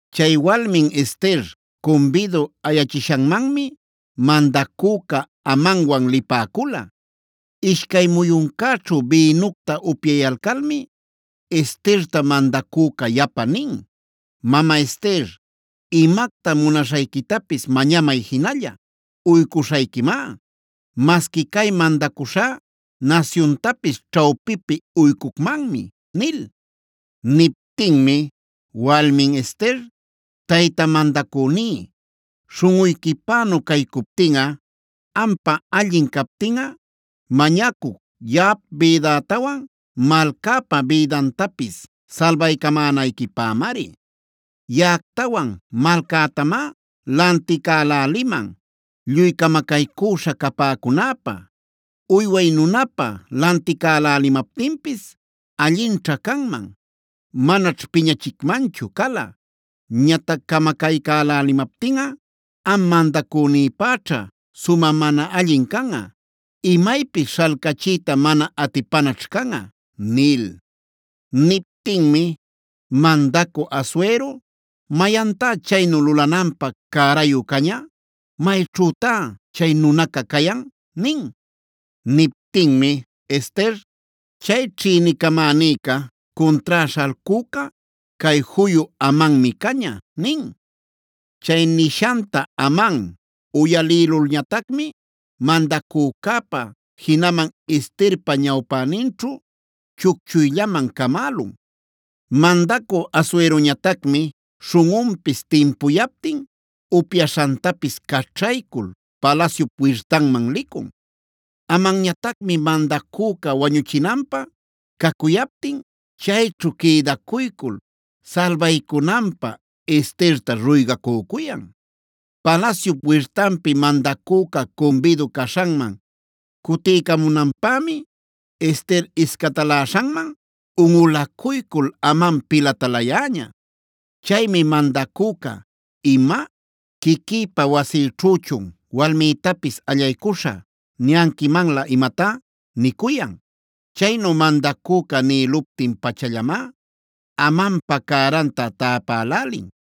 Chay walmin Ester cumbidu ayachishanmanmi mandacüca Amanwan lipäcula. Ishcay muyuncäćhu bïnucta upyayalcalmi Esterta mandacüca yapa nin: “Mama Ester, imacta munaśhayquitapis mañamay jinalla, uycuśhayquimá. Masqui cay mandacuśhá nasyuntapis ćhawpipi uycucmanmi” nil. Niptinmi walmin Ester: “Tayta mandacüní, śhunꞌuyquipänu caycuptinꞌa, ampä allin captinꞌa, mañacuc yaꞌap bïdätawan malcäpa bïdantapis salbaycamänayquipämari. Yaꞌactawan malcätamá lanticäläliman lluy camacaycüśha capäcunäpä. Uyway nunapä lanticälälimaptinpis allinćha canman, manaćh piñachicmanchu cala. Ñatac camacaycälälimaptinꞌa am mandacünïpäćha sumä mana allin canꞌa, imaypis śhalcachiyta mana atipanaćh canꞌa” nil. Niptinmi mandacü Asuero: “¿Mayantá chaynu lulananpä cärayu caña? ¿Mayćhütá chay nunaca cayan?” nin. Niptinmi Ester: “Chay ćhïnicamänica, cuntrá śhalcüca cay juyu Amanmi caña” nin. Chay nishanta Aman uyalïlulñatacmi mandacücäpa, jinaman Esterpa ñawpäninćhu chucchuyllaman camälun. Mandacü Asueroñatacmi śhunꞌunpis timpuyaptin upyaśhantapis caćhaycul palasyup wirtanman licun. Amanñatacmi mandacüca wañuchinanpä cacuyaptin chayćhu quïdacuycul salbaycunanpä Esterta ruygacücuyan. Palasyup wirtanpi mandacüca cumbidu caśhanman cutiycamunanpämi, Ester iscataläśhanman unꞌulacuycul Aman pilatalayäña. Chaymi mandacüca: “¡Ima! ¿¡Quiquïpa wasïćhüchun walmïtapis ‘allaycuśhä’ niyanquimanlä imatá!?” nicuyan. Chaynu mandacüca nïluptin-pachallamá Amanpa cäranta täpälälin.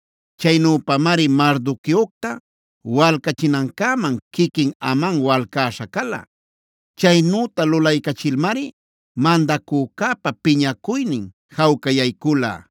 Chaynüpamari Mardoqueocta walcachinancäman quiquin Aman walcäśha cala. Chaynüta lulaycachilmari mandacücäpa piñacuynin jawcayaycula.